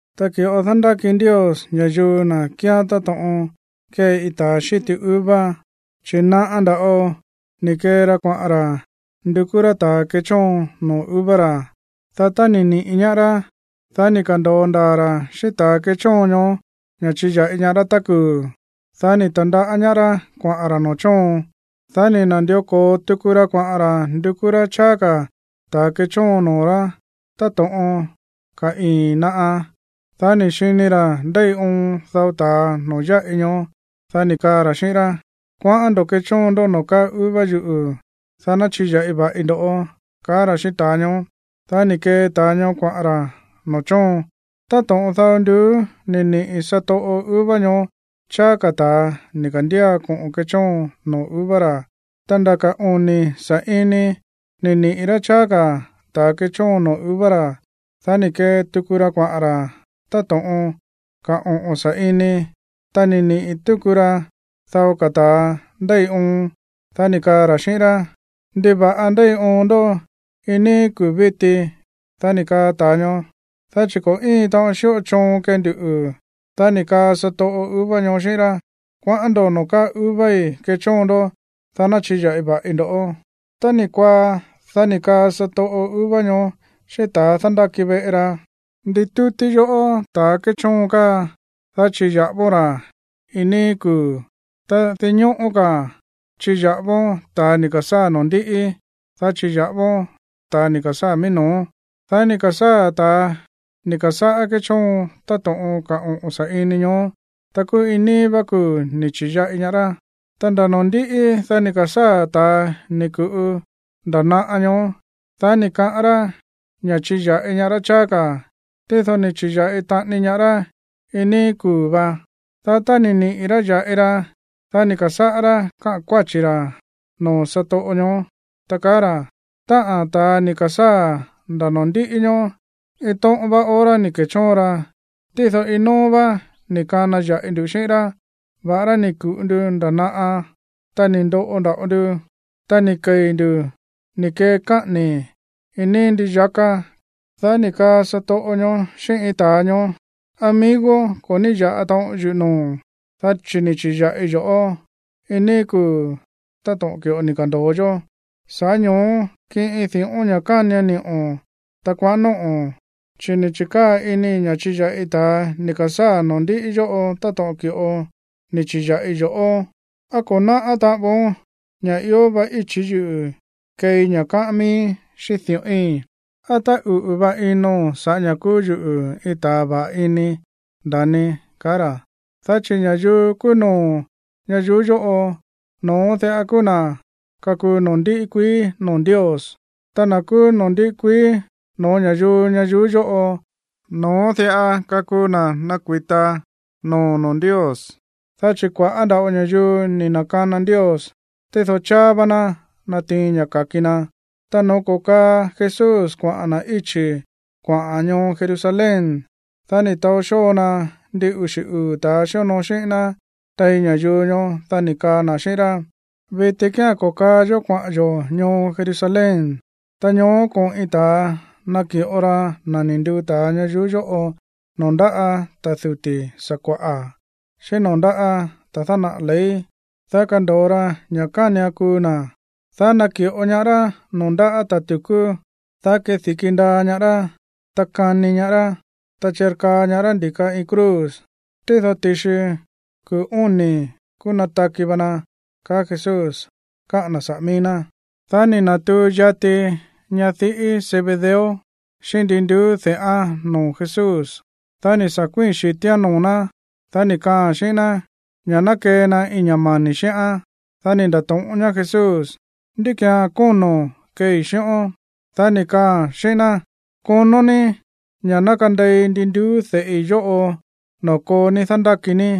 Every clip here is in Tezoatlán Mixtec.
’Tá ki̱ꞌo dándáki Ndios ña̱yuu na̱ kíán táto̱ꞌon kée iin ta̱a xíti uva, chi̱ naꞌa nda̱ꞌo ni̱ kee ra kuaꞌa̱n ra̱ ndukú rá ta̱a kechóon noo̱ uva ra̱. Dá tá ni̱ niꞌi̱ ñaá rá, dá ni̱ ka̱ndo̱o ndaa̱ ra̱ xíꞌín ta̱ kéchóon ñoó ña̱ chiya̱ꞌi ñaá rá tá kuu̱. Dá ni̱ ta̱ndaꞌá ñaá rá kuaꞌa̱n ra̱ noo̱ chóon. Dá ni̱ na̱ndió ko̱o tuku ra kuaꞌa̱n ra̱ ndukú rá cháá ka̱ ta̱ kechóon noo̱ rá táto̱ꞌon ka̱ ii̱n naꞌa. Dá ni̱ xini ra̱ ndéi oon dao ta̱a noo̱ yáꞌi ñoó. Dá ni̱ kaa ra̱ xíꞌín rá: “Kuaꞌán ndo̱ꞌó kechóon ndó noo̱ káa uva yuꞌu̱, dá ná chiya̱ꞌi va̱ꞌi ndo̱ꞌó”, kaá ra̱ xíꞌín ta̱a ñoó. Dá ni̱ kee ta̱a ñoó kuaꞌa̱n ra̱ noo̱ chóon. Táto̱ꞌon dao nduú ni̱ niꞌi̱ satoꞌo uva ñoó cháá ka̱ ta̱a ni̱ ka̱ndía koꞌo̱n kechóon noo̱ uva ra̱. Ta nda̱ ka̱ oni̱ sa̱ꞌini ni̱ niꞌi̱ rá cháá ka̱ ta̱a kechóon noo̱ uva ra̱. Dá ni̱ kee tuku ra kuaꞌa̱n ra̱ táto̱ꞌon ka̱ oꞌo̱n sa̱ꞌini, ta ni̱ niꞌi̱ túku ra dao ka̱ ta̱a ndéi oon. Dá ni̱ kaa ra̱ xíꞌín rá: “¿Ndiva̱ꞌa ndéi oon ndó iin níí kuu̱ víti?” Dá ni̱ kaa ta̱a ñoó: “Dá chi̱ ko̱ íin taꞌon xíꞌo choon kee nduꞌu̱.” Dá ni̱ kaa satoꞌo uva ñoó xíꞌín rá: “Kuaꞌán ndo̱ noo̱ káa uvai̱ kechóon ndó, dá ná chiya̱ꞌi va̱ꞌi ndo̱.” Tá ni̱ kuaá, dá ni̱ kaa satoꞌo uva ñoó xíꞌín ta̱ dándáki veꞌe ra: “Nditútí yoꞌó ta̱ kéchóon káa, dá chiya̱ꞌávón ra̱ iin níí kuu̱. Ta dinñóꞌó ka̱ chiya̱ꞌávón ta̱ ni̱ ka̱sáa̱ noo̱ ndíꞌí, dá chiya̱ꞌávón ta̱ ni̱ ka̱sáa̱ mií no̱ó.” Dá ni̱ ka̱sáa̱ ta̱a ni̱ ka̱sáꞌá kéchóon táto̱ꞌon ka̱ oꞌo̱n sa̱ꞌini ñoó, ta kúú iin níí vá kuu̱ ni̱ chi̱ya̱ꞌi ñaá rá. Tá nda̱ noo̱ ndíꞌí, dá ni̱ ka̱sáa̱ ta̱a ni̱ ku̱ꞌu nda̱ naꞌa ñoó. Dá ni̱ kaꞌán rá ña̱ chiya̱ꞌi ñaá rá cháá ka̱. Tído ni̱ chi̱ya̱ꞌi taꞌani ñaá rá iin níí kuu̱ vá. Dá tá ni̱ niꞌi̱ rá ya̱ꞌi ra, dá ni̱ ka̱sáꞌá rá káꞌa̱n kuáchi̱ ra̱ noo̱ satoꞌo ñoó, ta kaá ra̱: “Táꞌa̱n ta̱a ni̱ ka̱sáa̱ nda̱ noo̱ ndíꞌí ñóó, iin tóꞌón vá hora ni̱ ke̱chóon ra, tído, iin nóó vá ni̱ kana ya̱ꞌi nduꞌu̱ xíꞌín rá, va̱ꞌará ni̱ ku̱ꞌu ndu nda̱ naꞌa, ta ni̱ ndoꞌo nda̱ꞌo ndu, ta ni̱ kei̱ ndu̱ ni̱ kee káꞌa̱ni̱ iin níí ndii yaká.” Dá ni̱ kaa satoꞌo ñoó xíꞌín iin ta̱a ñoó: “Amigo, ko̱ ní ya̱ꞌa taꞌon yuꞌu̱ noo̱o̱n, dá chi̱ ni̱ chi̱ya̱ꞌii yo̱ꞌó iin níí kuu̱ táto̱ꞌon ki̱ꞌo ni̱ ka̱ndo̱o yó. Sa̱ꞌá ño̱ó, kiꞌin di̱ꞌón ña̱ kánian ni̱ꞌo̱n, ta kuaꞌa̱n nóꞌo̱n. Chi̱ ni̱ chi̱kaa̱ inii̱ ña̱ chiya̱ꞌi ta̱ ni̱ ka̱sáa̱ noo̱ ndíꞌí yóꞌo táto̱ꞌon ki̱ꞌo ni̱ chi̱ya̱ꞌii yo̱ꞌó. ¿Á ko̱ náꞌá taꞌan voón ña̱ ió va íchi̱ yuꞌu̱ keei ña̱ káꞌán miíí xíꞌín di̱ꞌói̱n? ¿Á táꞌuꞌu̱ va ino̱n sa̱ꞌá ña̱ kúú yuꞌu̱ iin ta̱ va̱ꞌa ini, nda̱ni?”, kaá ra̱. Dá chi̱ ña̱yuu kúú no̱ó ñayuú yóꞌo, no̱ón diꞌa kúú na̱ kakuu noo̱ ndíꞌí kuií noo̱ Ndios. Ta na̱ kúú noo̱ ndíꞌí kuií no̱ó ña̱yuu ñayuú yóꞌo, no̱ón diꞌa kakuu na̱ nakui̱ta noo̱ noo̱ Ndios. Dá chi̱ kua̱ꞌá nda̱ꞌo ña̱yuu ni̱ na̱kana Ndios, tído cháá vá ná natiin ña̱ ka̱ki na. Ta no̱ó ko̱kaa Jesús kuaꞌa̱n na̱ íchi̱ kuaꞌa̱n ñoo Jerusalén, dá ni̱ taó xóo na ndin uxi̱ uu̱ ta̱ xíonoo xíꞌín ná tein ña̱yuu ñoó, dá ni̱ kaa na̱ xíꞌín rá: ―Viti kía̱n ko̱kaa yó kuaꞌa̱n yo̱ ñoo Jerusalén. Ta ñoó koꞌo̱n iin ta̱a naki̱ꞌo ra na̱ ni̱ nduu ta̱a ñayuú yóꞌo noo̱ ndáꞌa̱ ta̱ duti̱ sakua̱ꞌa̱, xíꞌín noo̱ ndáꞌa̱ ta̱ dánaꞌa̱ ley. Dá kando̱o ra ña̱ kánian kuu na̱, dá naki̱ꞌo ñaá rá noo̱ ndáꞌa̱ ta̱ tu̱kú. Dá kedi̱ki ndaa ñaá rá, ta kani ñaá rá, ta chirkaa ñaá rá ndi̱ka iin cruz. Tído ti̱xi kuu̱ óni̱, kúú nataki va na ―kaá Jesús káꞌa̱n na̱ saꞌa̱ mií ná. Dá ni̱ na̱tuu yati ñadiꞌí Zebedeo xíꞌín ndi nduú de̱ꞌán noo̱ Jesús. Dá ni̱ sa̱ kuíi̱n xi̱tíán noo̱ ná. Dá ni̱ kaꞌa̱n xíꞌín ná ña̱ ná kee na iin ña̱ mani̱ xíꞌán. Dá ni̱ nda̱to̱ꞌón ñaá Jesús: ―¿Ndí ki̱án kóno̱n keei xíꞌón? Dá ni̱ kaaa̱n xíꞌín ná: ―Konó ní ña̱ ná kandei ndi nduú de̱ꞌi yóꞌo noo̱ koo ní dándáki ní.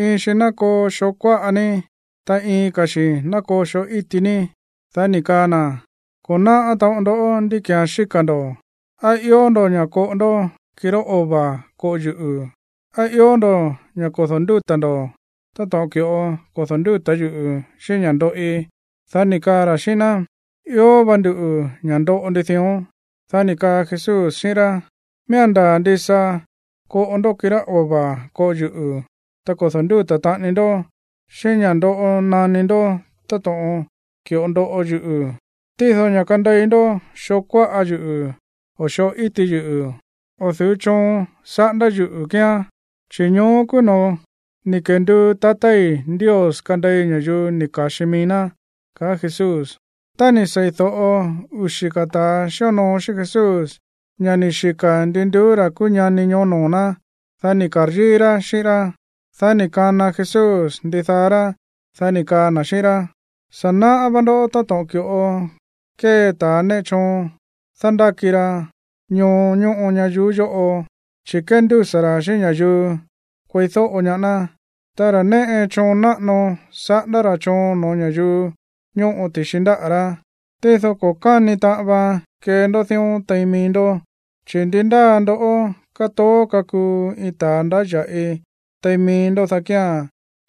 Iin xi ná koo xoo kuáꞌa ní, ta iin ka̱ xi̱ ná koo xoo íti ní. Dá ni̱ kaa na̱: ―Ko̱ náꞌá taꞌon ndoꞌó ndí ki̱án xíka̱ ndo̱. ¿Á ió ndo̱ ña̱ koꞌo ndó kirá ova̱ koꞌo yuꞌu̱? ¿Á ió ndo̱ ña̱ kodo̱ ndúta̱ ndo̱ táto̱ꞌon ki̱ꞌo kodo̱ ndúta̱ yuꞌu̱ xíꞌín ña̱ ndoꞌi? Dá ni̱ kaa ra̱ xíꞌín ná: ―Ió va nduꞌu̱ ña̱ ndoꞌo ndu dión. Dá ni̱ kaa Jesús xíꞌín rá: ―Miía̱n ndaa̱ ndisa koꞌo ndoꞌó kirá ova̱ koꞌo yuꞌu̱, ta kodo̱ ndúta̱ taꞌani ndó xíꞌín ña̱ ndoꞌo naní ndó táto̱ꞌon ki̱ꞌo ndoꞌo yuꞌu̱. Tído ña̱ kandei ndó xoo kuáꞌa yuꞌu̱ o xoo íti yuꞌu̱, o̱ du̱ú choon saꞌándá yuꞌu̱ kíán. Chi̱ ñoó kúú noo̱ ni̱ kenduu tatái̱ Ndios kandei ña̱yuu ni̱ ka̱xi mií ná ―kaá Jesús. Tá ni̱ sei̱do̱ꞌo uxi̱ ka̱ ta̱a xíonoo xíꞌín Jesús ña̱ ni̱ xika̱ ndi nduú ra̱ kúú ñani ñoó noo̱ ná, dá ni̱ ka̱ryíí rá xíꞌín rá. Dá ni̱ kana Jesús ndidaá rá, dá ni̱ kaa na̱ xíꞌín rá: ―Sa̱ náꞌá vá ndó táto̱ꞌon ki̱ꞌo kée ta̱ néꞌe choon dándáki ra ñoo ñóꞌo ñayuú yóꞌo, chi̱ kéndúsa̱ ra̱ xíꞌín ña̱yuu kueídóꞌo ñaá ná. Ta ra̱ néꞌe choon náꞌano saꞌándá ra̱ choon no̱ó ña̱yuu ñóꞌo ti̱xi ndáꞌa̱ rá. Tído ko̱ káni taꞌan vaan kee ndó dión tein mií ndó. Chi̱ ndi ndáa ndoꞌó kátoó kakuu iin ta̱a ndáya̱ꞌi tein mií ndó, dá kía̱n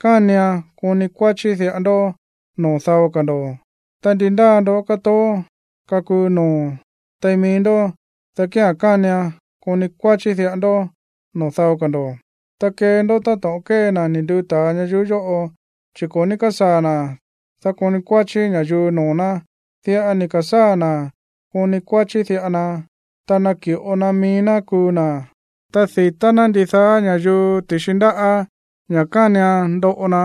kánian koni kuáchí diꞌa ndó noo̱ dao ka̱ ndo̱. Ta ndi ndáa ndoꞌó kátoó kakuu noo̱ tein mií ndó, dá kía̱n kánian koni kuáchí diꞌa ndó noo̱ dao ka̱ ndo̱, ta kee ndó táto̱ꞌon kée na̱ ni̱ nduu ta̱a ñayuú yóꞌo, chi̱ ko̱ ní kásaa̱ na̱, dá koni kuáchí ña̱yuu noo̱ ná. Diꞌa ni̱ ka̱sáa̱ na̱ koni kuáchí diꞌa na, ta naki̱ꞌo na mií ná kuu na̱, dá di̱tá ná ndidaá ña̱yuu ti̱xi ndáꞌa̱ ña̱ kánian ndoꞌo na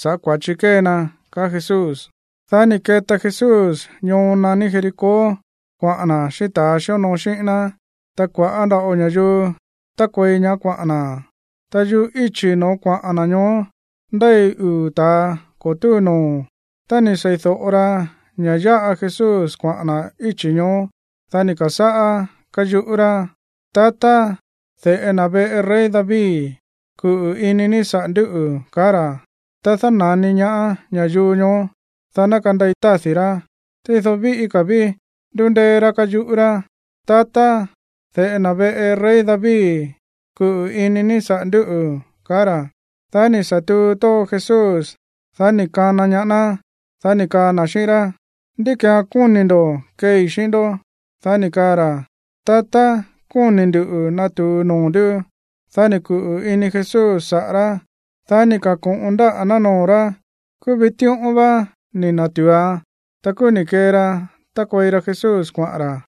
sa̱ꞌá kua̱chi kée na ―kaá Jesús. Dá ni̱ keta Jesús ñoo naní Jericó kuaꞌa̱n na̱ xíꞌín ta̱a xíonoo xíꞌín na̱. Ta kua̱ꞌá nda̱ꞌo ña̱yuu tákuei ñaá kuaꞌa̱n na̱. Ta yuꞌú íchi̱ no̱ó kuaꞌa̱n na̱ ñoó ndéi uu̱ ta̱a ko̱ túu noo̱. Tá ni̱ sei̱do̱ꞌo ra ña̱ yáꞌa Jesús kuaꞌa̱n na̱ íchi̱ ñoó, dá ni̱ ka̱sáꞌá káyuꞌú rá: ―¡Tatá, de̱ꞌe na̱ veꞌe rey David, kuꞌu̱ ini ní saꞌa̱ ndúꞌu̱! ―kaá ra̱. Ta dána̱ni ñaá ña̱yuu ñoó, dá ná kandei tádi̱ rá. Tído kúú víꞌí ka̱ ví ndúndéé rá káyuꞌú rá: ―¡Tatá, de̱ꞌe na̱ veꞌe rey David, kuꞌu̱ ini ní saꞌa̱ ndúꞌu̱! ―ka̱á ra̱. Dá ni̱ sa̱ tuu tóo Jesús, dá ni̱ kana ñaá ná, dá ni̱ kaa na̱ xíꞌín rá: ―¿Ndí ki̱án kóni̱ ndo̱ keei xíꞌín ndó? Dá ni̱ kaa ra̱: ―Tatá, kóni̱ ndu̱ natu̱u noo̱ ndú. Dá ni̱ kuꞌu̱ ini Jesús saꞌa̱ rá. Dá ni̱ ka̱ko̱ꞌon ndáꞌa̱ ná noo̱ rá. Kúú vitíꞌón vá ni̱ na̱tu̱uan. Ta kúú ni̱ kee ra tákuei ra Jesús kuaꞌa̱n ra̱.